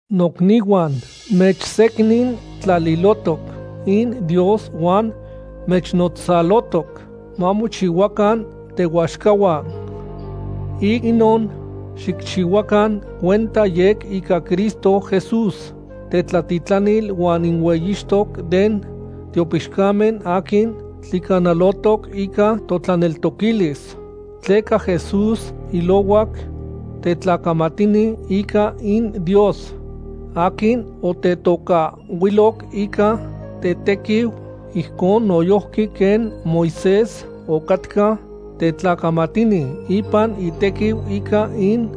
Nocnihuan, mechsecnintlalilohtoc in Dios huan mechnotzalohtoc mamochihuacan tehuaxcahuan. Ic inon xicchihuacan cuenta yec ica Cristo Jesús, tetlatitlanil huan in hueyixtoc den tiopixcamen aquin tlicanalotoc ica totlaneltoquilis. Tleca Jesús ilohuac tetlacamatini ica in Dios, aquin otetocahhuiloc ica tetequiu, ijcon noyojqui quen Moisés ocatca tetlacamatini ipan itequiu ica in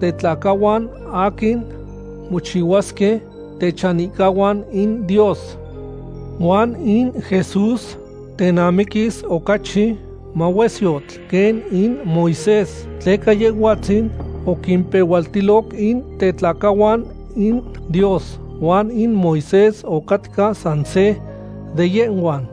tetlacahuan aquin mochihuasque techanihcahuan in Dios. Huan in Jesús tenamiquis ocachi mahuesyotl quen in Moisés, tleca Yehhuatzin oquimpehualtiloc in tetlacahuan in Dios huan in Moisés ocatca san se de yehhuan.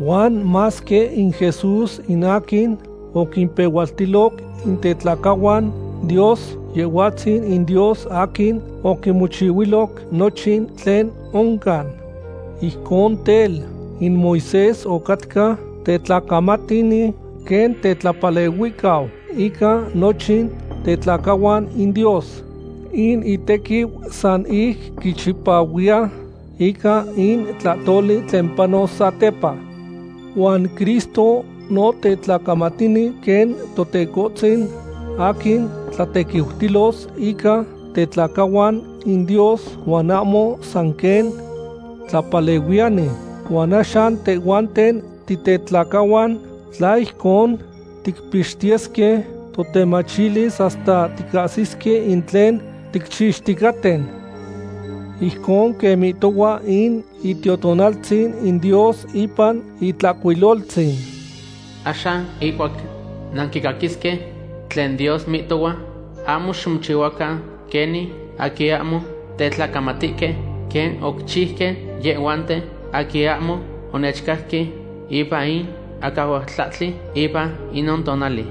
Huan masque in Jesús in aquin oquimpehualtiloc in tetlacahuan Dios, Yehhuatzin in Dios aquin oquimochihuiloc nochin tlen oncan. Ijcon tel, in Moisés ocatca tetlacamatini quen tetlapalehuihcau ica nochin tetlacahuan in Dios. In itequiu san ic quichipahuiya ica in tlahtoli tlen panos satepa. Huan Cristo no tetlacamatini quen Teconetzin aquin tlatequiutilos ica tetlacahuan in Dios huan ahmo san quen tlapalehuiyani. Huan axan tehhuanten titetlacahuan, tla ijcon ticpixtiyesque totemachilis hasta ticahsisque in tlen ticchixticaten. Ijcon quen mihtohua in Itiotonaltzin in Dios ipan Itlahcuiloltzin: Axan ihcuac nanquicaquisque tlen Dios mihtohua, ahmo ximochihuacan quenin aquin ahmo tetlacamatihque quen oquichiuque yehhuanten aquin ahmo onechcajque ipan in acahualtlahtli ipan inon tonali.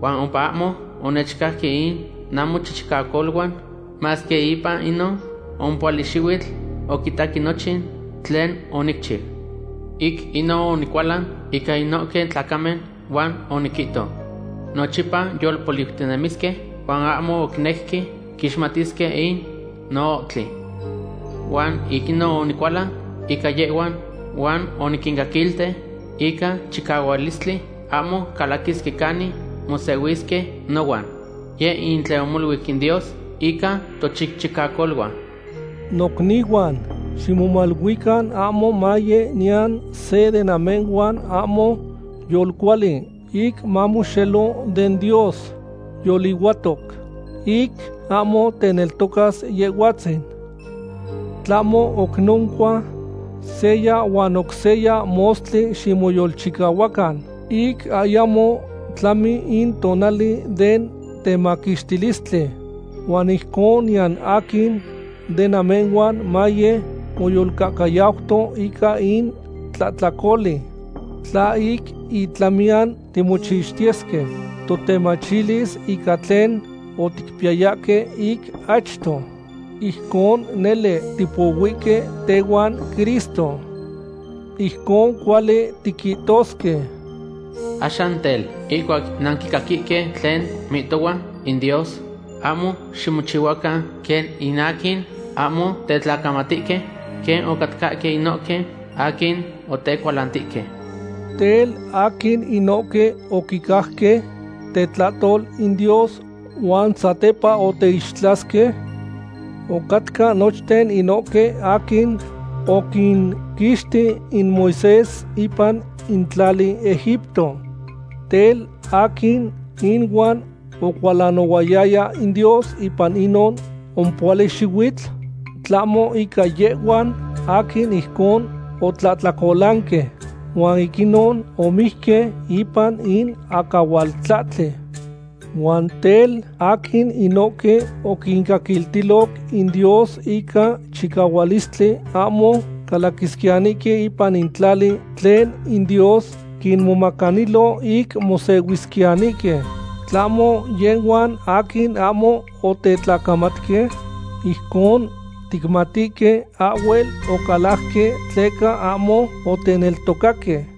Huan ompa ahmo onechcajque in namochichicacoluan, masque ipan inon ompohuali xihuitl oquitaque nochin tlen onicchiu. Ic inon onicualan ica inohque tlacamen, huan oniquihto: “Nochipa yolpoliutinemisque, huan ahmo oquinejque quixmatisque in noohtli.” Huan ic inon onicualan ica yehhuan huan oniquincaquilti ica chicahualistli, ahmo calaquisque canin mosehuisque nohuan. Yeh in tlen omoluic in Dios ica tochichicacoluan. Nocnihuan, ximomaluican ahmo maye niyan se de namehhuan ahmo yolcuali ic mamoxelo den Dios yolihuatoc, ic ahmo teneltocas Yehhuatzin. Tlahmo oc noncua, seya huan oc seya mostli ximoyolchicahuacan ic ayamo tlami in tonali den temaquixtilistli, huan ijcon niyan aquin de namehhuan maye moyolcahcayauto ica in tlahtlacoli. Tla ic itlamiyan timochixtiyesque totemachilis ica tlen oticpiyayahque ic achto, ijcon nele tipohuihque tehuan Cristo. Ijcon cuali tiquihtosque: Axan tel, ihcuac nanquicaquihque tlen mihtohua in Dios, ahmo ximochihuacan quen in aquin ahmo tetlacamatihque, quen ocatcahque inohque aquin otecualantihque. Tel, ¿aquin inohque oquicajque tetlahtol in Dios huan satepa oteixtlasque? Ocatca nochten inohque aquin oquinquixti in Moisés ipan in tlali Egipto. Tel, ¿aquin inuan ocualanohualtoya in Dios ipan inon ompohuali xihuitl? Tlahmo ica yehhuan aquin ijcon otlahtlacolanque, huan ic inon omijque ipan in acahualtlahtli. Huan tel, ¿aquin inohque oquincaquiltiloc in Dios ica chicahualistli ahmo calaquisquiyanihque ipan in tlali tlen in Dios quinmomacanilo ic mosehuisquiyanihque, tlahmo yehhuan aquin ahmo otetlacamatque? Ijcon ticmatihque ahhuel ocalajque tleca ahmo oteneltocaque.